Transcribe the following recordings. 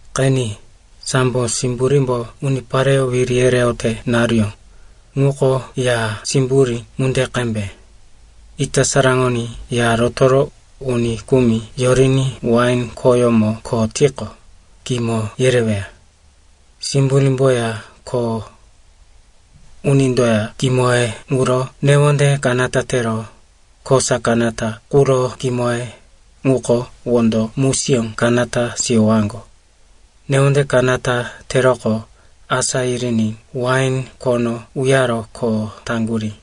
“Qeni, sambo simburímbo unipareyó wiri yereyote naruyó ŋuko ya simburí ŋunde qembe. Ita saraŋoní ya rotoro uni kumi yoriní wain khoyómo kho tiqo, kimo yereweya. Simburímboya kho unindoya kimoye ŋuro newonde kanata tero kosa kanata quro kimoye ŋuko wondo musiyó kanata siyowaŋgo. Newonde kanata teroqo, asá yiriní wain khono uyaro kho taŋgurí.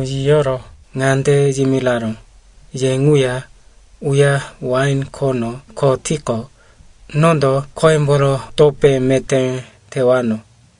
yiyoro ŋande yimiraró, ‘Ye ŋuya uya wain khono kho tiqo, nondo khoyemboro topé meté tewano.’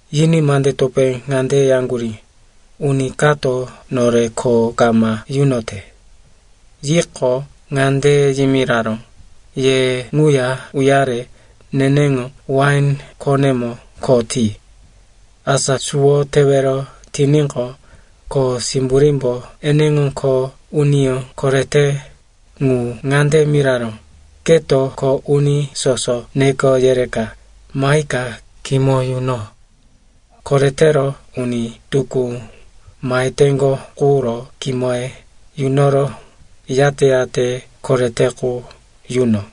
“Yiní mande topé ŋande yaŋgurí, ‘Uni kato nore kho kama yunote.’ “Yiqo, ŋande yimiraró, ‘Ye ŋuya uyare neneŋo wain khonemo kho ti.’ “Asa suwo tewero tiníqo, kho simburímbo eneŋo kho uniyó korete ŋu ŋande miraró, ‘Keto kho uni soso neko yereka mahika kimo yuno. Koretero uni tukú maheteŋgo quro kimoye yunoro, yate-yate korete qu yuno.’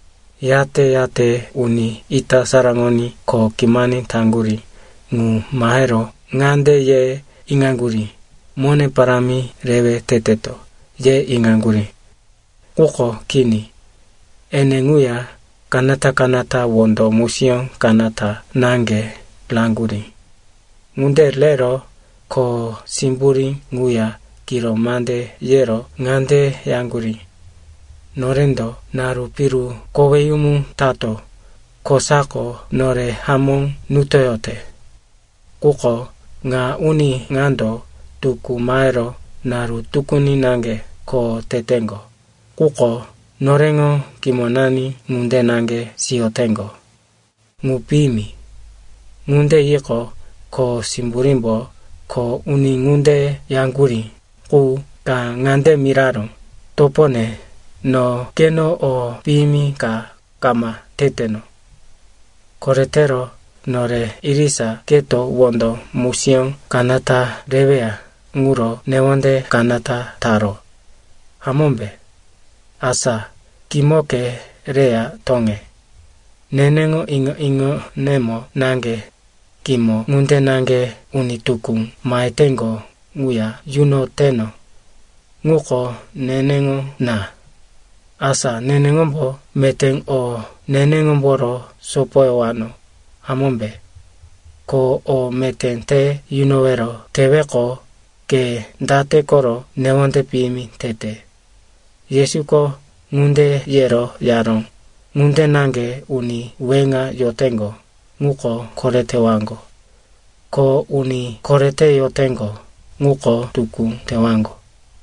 Yate-yate uni ita saraŋoní kho kimani taŋgurí ŋu mahero ŋande ye iŋaŋgurí, mone parámi rewe teteto, ye iŋaŋgurí. Quko kini. Ene ŋuya kanata-kanata wondo musiyó kanata naŋge raŋgurí. Ŋunde rero kho simburí ŋuya kiro mande yero ŋande yaŋgurí, ‘Norendo naru piru koweyumu tato kosako nore hamó nutoyote. Quko ŋa uni ŋando tukú mahero naru tukuni naŋge kho teteŋgo, quko noreŋo kimonani ŋunde naŋge siyoteŋgo. Ŋu piyimi.’ “Ŋunde yiqo, kho simburímbo kho uni ŋunde yaŋgurí qu ka ŋande miraró, ‘Topone, no keno o piyimi ka kama teteno. Koretero nore irisa keto wondo musiyó kanata reweya ŋuro newonde kanata taro, hamómbe? Asa, kimoke reya toŋe. Neneŋo iŋo-iŋonemo naŋge kimo ŋunde naŋge uni tukú maheteŋgo ŋuya yunoteno. Ŋuko neneŋo na. Asa neneŋombo meté o neneŋomboro sopoyowano, hamómbe? Ko o meté te yunowero teweqo, ke date koro newonde piyimi tete?’” Yesuko ŋunde yero yaró, “Ŋunde naŋge uni weŋa yoteŋgo ŋuko koretewaŋgo. Ko uni korete yoteŋgo, ŋuko tukú tewaŋgo.”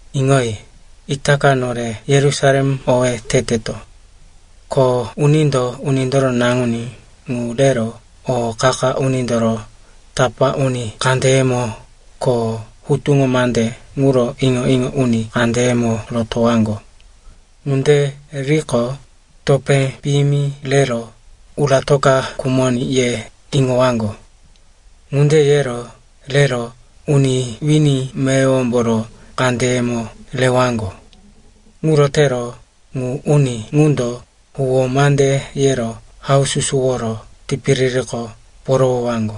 “Iŋoyi, itaka nore Yerusalem owé teteto. Ko unindo Unindoro Naŋuní ŋu rero o qa-qa unindoro tapá uni kandeyemo ko hutuŋo mande ŋuro iŋo-iŋo uni kandeyemo rotowaŋgo. Ŋunde riqo, topé piyimi rero, uratoka khumoní, ye iŋowaŋgo. Ŋunde yero rero uni wini meyowomboro kandeyemo rewaŋgo. Ŋuro tero ŋu uni ŋundo huwó mande yero haususuworo tipiririko porowowaŋgo.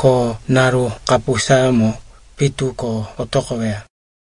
Ko naru kapusayómo pitu ko otoqoweya.”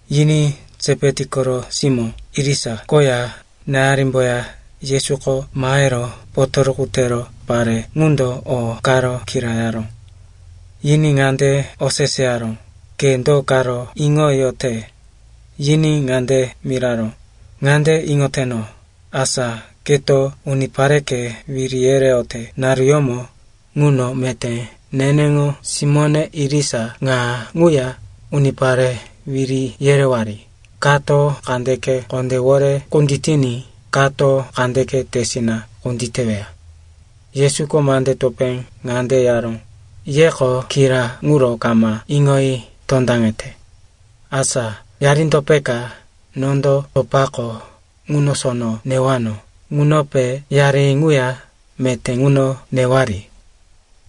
Yiní Sepeti koro simó irisa koya náyarimboya Yesuko mahero potoruku tero pare ŋundo o karo kirayaró. Yiní ŋande oseseyaró, “Ke do karo iŋoyote?” Yiní ŋande miraró, “Ŋande iŋoteno, asa keto unipareke wiri yereyote naruyómo ŋuno meté neneŋo simóne irisa ŋa ŋuya unipare wiri yerewari, kato kandeke kondéwore kunditiní kato kandeke tesina kunditeweya.” Yesuko mande topé ŋande yaró, “Yeko kira ŋuro kama iŋoyi tondaŋete. Asa yarindo peka nondo topako ŋuno sono newano ŋunope yari ŋuya meté ŋuno newari?”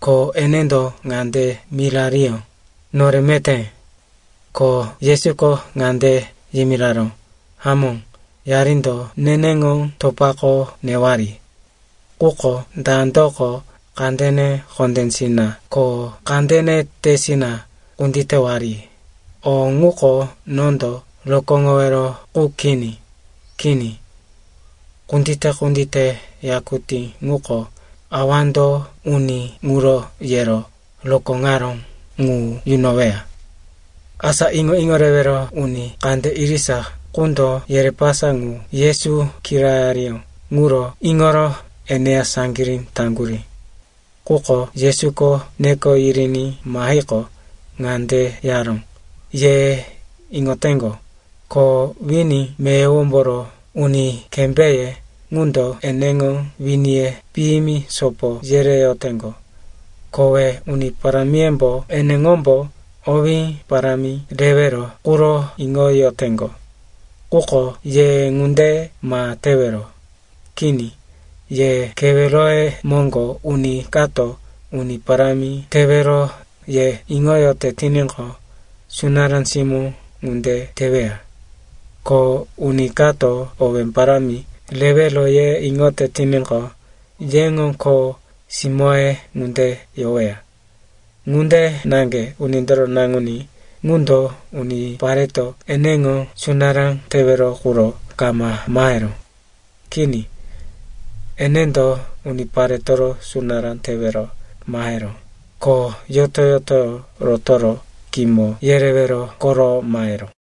Ko enendo ŋande mirariyó, “Nore meté.” Ko Yesuko ŋande yimiraró, “Hamó, yarindo neneŋo topako newari. Quko dandoko kandene kondésina ko kandene tesina kunditewari, o ŋuko nondo rokóŋowero qu kini. Kini. Kundite-kundite yakutí ŋuko awando uni ŋuro yero rokóŋaró ŋu yunoweya.” Asa iŋo-iŋo rewero uni kande irisa qundo yerepasa ŋu Yesu kirayariyó ŋuro iŋoro eneya saŋgirí taŋgurí. Quko Yesuko neko yiriní mahiqo, ŋande yaró, “Ye iŋoteŋgo, ko wini meyowomboro uni kembéye ŋundo eneŋo winiye piyimi sopo yereyoteŋgo. Kowe uni parámiyembo eneŋombo owé parámi rewero quro iŋoyoteŋgo. Quko ye ŋunde ma tewero. Kini, ye keweroye moŋgo uni kato uni parámi tewero ye iŋoyote tiníqo, sunará simó ŋunde teweya. Ko uni kato owé parámi rewero ye iŋoyote tiníqo, yeŋo kho simóye ŋunde yoweya. Ŋunde naŋge Unindoro Naŋuní ŋundo unipareto eneŋo sunará tewero quro kama maheró. Kini, enendo uniparetoro sunará tewero maheró, ko yoto-yotoyó rotoro kimo yerewero koro maheró.”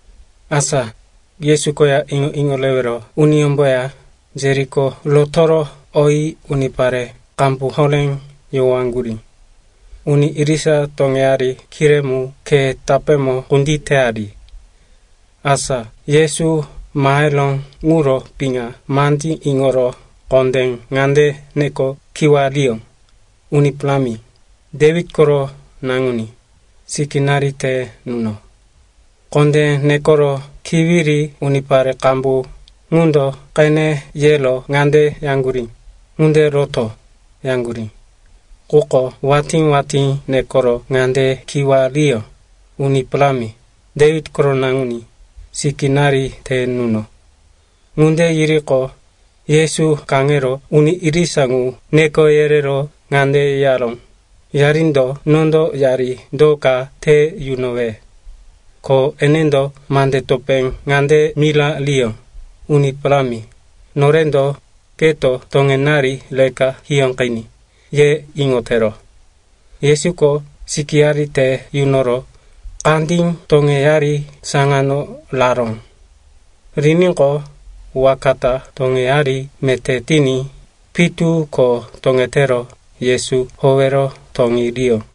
Asa Yesu koya iŋo-iŋo rewero uniyómboya Jeriko rotoro oyi unipare qambu horé yohowaŋgurí. Uni irisa toŋeyari kiré mu khe tapémo kunditeyari. Asa Yesu maheró ŋuro piŋa mande iŋoro kondé ŋande neko kiwariyó, “Uni Parámi, Dewit koro naŋuní, sikínari te nuno.” Kondé nekoro kiwiri unipare qambu ŋundo qene yero ŋande yaŋgurí, “Ŋunde roto!” yaŋgurí. Quko watí-watí nekoro ŋande kiwariyó, “Uni Parámi, Dewit koro naŋuní, sikínari te nuno.” Ŋunde yiriqo, Yesu kaŋero uni irisa ŋu neko yerero ŋande yaró, “Yarindo nondo yari do ka te yunowe?” Ko enendo mande topé ŋande mirariyó, “Uni Parámi, norendo, keto toŋenari reka hiyóqiní, ye iŋotero.” Yesuko sikíyari te yunoro kandí toŋeyari saŋano raró. Riníqo, waka ta toŋeyari meté tiní pitu ko toŋetero Yesu howero toŋeriyó.